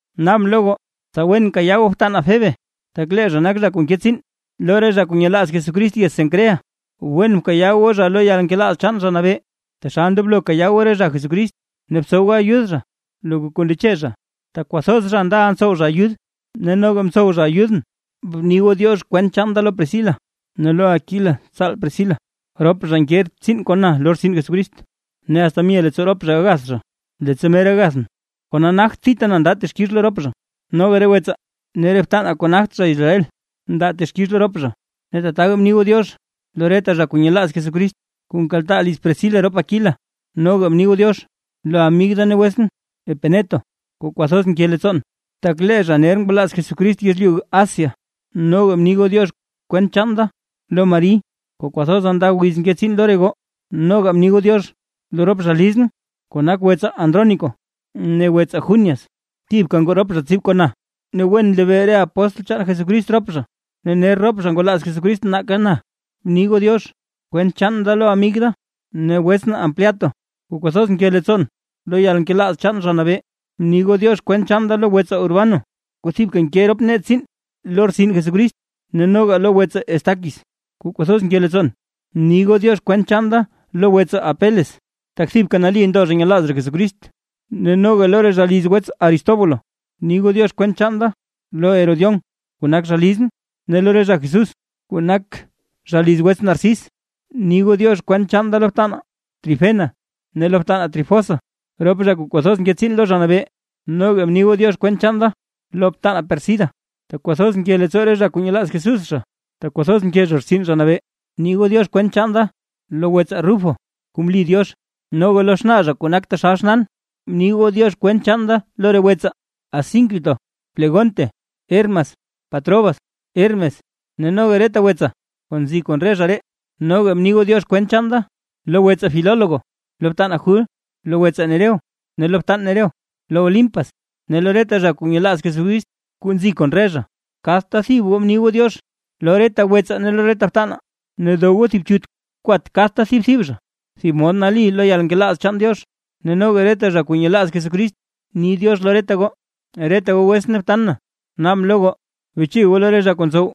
Naabʼn lo goo tsa wen kayaa goo btanaa Febe, tak lee zha nak zha kuu nke tsiin lo re zha kuu nyelaaz Jesucrist yez Cencrea. Wen bkayaa goo zha lo yalnkelaaz chaan Zha Nabee, taxal ndoblo kayaa goo re zha Jesucrist. Ne btsow goo ayud zha loka kuu ndeche zha, tak kwathoz zha ndaʼa ntsow zha ayud, ne noga mtsow zha ayudʼn. Bni goo “diox” kwent chaan da lo Priscila ne lo Aquila tsaal priscila, rop zha nke tsiin kon na lo rtsin Jesucrist. Ne asta mye leettsoo rop zha gagath zha, leettsa mer gagathʼn, kona nagt thita na nda texkix lo rop zha, noga re wetsaa ne re btanaa kuu nagt zha Israel ndaa texkix lo rop zha. Ne tataka bni goo “diox” lo reta zha kuu nyelaaz Jesucrist kuu nkaltaa liz Priscila rop Aquila. Noga bni goo “diox” lo amig da ne wetsʼn Epeneto kuu kwathoz nke leettsoon, tak lee zha ner ngwalaaz Jesucrist yezlyu Asia. Noga bni goo “diox” kwent chaan da lo Mari kuu kwathoza nda wiz nke tsiin lo re goo. Noga bni goo “diox” lo rop zha lizʼn kuu nak wetsaa Andrónico ne wetsaa Junias, thibka ngoo rop zha tsib kon na. Ne wen nlebee re apóstl chaan Jesucrist rop zha, ne ner rop zha ngwalaaz Jesucrist nake na. Bni goo “diox” kwent chaan da lo amig da ne wetsʼn Ampliato kuu kwathoz nke leettsoon lo yalnkelaaz chaan Zha Nabee. Bni goo “diox” kwent chaan da lo wetsaa Urbano kuu thibka nke rop nee tsiin lo rtsin Jesucrist, ne noga lo wetsaa Estaquis kuu kwathoz nke leettsoon. Bni goo “diox” kwent chaan da lo wetsaa Apeles, tak thibka nali ndo zha nyelaaz zha Jesucrist; ne noga lo re zha liz wets Aristóbulo. Bni goo “diox” kwent chaan da lo Herodión kuu nak zha lizʼn, ne lo re zha Jesús kuu nak zha liz wets Narcis. Bni goo “diox” kwent chaan da lo btanaa Trifena ne lo btanaa Trifosa, rop zha kuu kwathoz nke tsiin lo Zha Nabee. Noga bni goo “diox” kwent chaan da lo btanaa Pérsida, tak kwathoz nke leettsoo re zha kuu nyelaaz Jesús zha, tak kwathoz mke zha rtsin Zha Nabee. Bni goo “diox” kwent chaan da lo wetsaa Rufo kuu mli Diox; noga lo xnaa zha kuu nak taxal xnaan. Bni goo “diox” kwent chaan da lo re wetsaa, Asíncrito, Flegonte, Hermas, Patrobas, Hermes ne noga lo reta wetsaa kuu nzi kon re zha ree. Noga bni goo “diox” kwent chaan da lo wetsaa Filólogo, lo btanaa Jul, lo wetsaa Nereo ne lo btan Nereo, lo Olimpas ne lo reta zha kuu nyelaaz Jesucrist kuu nzi kon re zha. Kadta thib goo bni goo “diox” lo reta wetsaa ne lo re btanaa, ne dow goo thib chut kwat kadta thib zha thib mod nali lo yalnkelaaz chaan Diox. Ne noga reta zha kuu nyelaaz Jesucrist ni “diox” lo reta goo. Reta goo wetsʼn ne btan na, naabʼn lo goo beche goo lo re zha kuu ntsow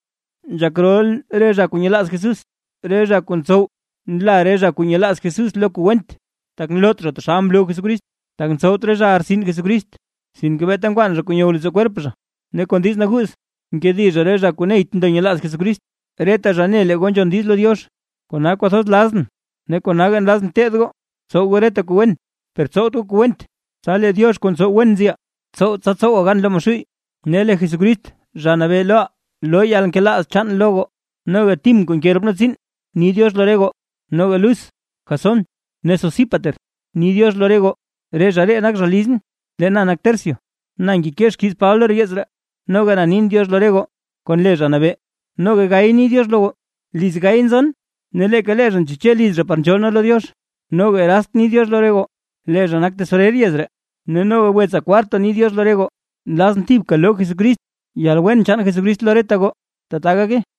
nzhak rol re zha kuu nyelaaz Jesús; re zha kuu ntsow nla re zha kuu nyelaaz Jesús lo kuu went, tak nloot zha taxal mloo Jesucrist. Tak ntsowt re zhaʼa rtsin Jesucrist, sinke beeta nkwaan zha kuu nyow leettsoo kwerp zha, ne kon diiz naguuz nkedi zha re zha kuu neyt ndo nyelaaz Jesucrist. Reta zha ne lee re goo nzhon diiz lo Diox; kona kwathoz lazʼn ne konaga nlazʼn teed goo tsow goo reta kuu wen, per tsowt goo kuu went. Tsa lee Diox kuu ntsow wen nziʼaa, tsow tsa tsowaa gan lo Maxuuy. Ne lee Jesucrist, Zha Nabee loʼaa loo yalnkelaaz chaan lo goo. Noga Tim kuu nke rop nee tsiin, ni “diox” lo re goo. Noga Lus, Jasón ne Sosípater ni “diox” lo goo, re zha ree nak zha lizʼn. Lee na nak Tercio, na ngekee xkiiz Paba lo yeets ree, noga na nin “diox” lo re goo kon le Zha Nabee. Noga Gayo ni “diox” lo goo, liz Gayo nzon, ne leeka zha ntseche liz zha par nzhool nee lo Diox. Noga Erast ni “diox” lo re goo, lee zha nak tesorer yez ree, ne noga wetsaa Kwarto ni “diox” lo re goo. Nlazʼn thibka loo Jesucrist yalwen chaan Jesucrist lo reta goo. Tata gake.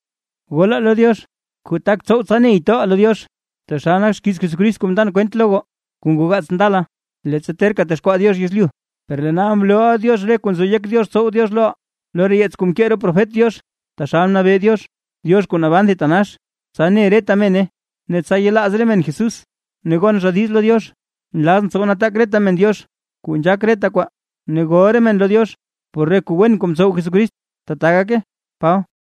Golaa lo Diox kuu tak tsow tsa ney toʼaa lo Diox, taxal nak xkiiz Jesucrist kuu mndan kwent lo goo, kuu ngoo gaats ndala leettsa terka texkwaa Diox yezlyu. Per lee nal mloo Diox re kuu nzo yek Diox tsow Diox loʼaa, lo re yeets kuu mkee re profet Diox taxal mnabee Diox, Diox kuu naban thitanax, tsa ne reta mene ne tsa yelaaz re men Jesús ne gon zha diiz lo Diox. ¡Nlazʼn tsow nataak reta men Diox kuu nzhaak reta kwaa, ne gol re men lo Diox por kuu wen kuu mtsow Jesucrist! ¡Tbaa gake! Paba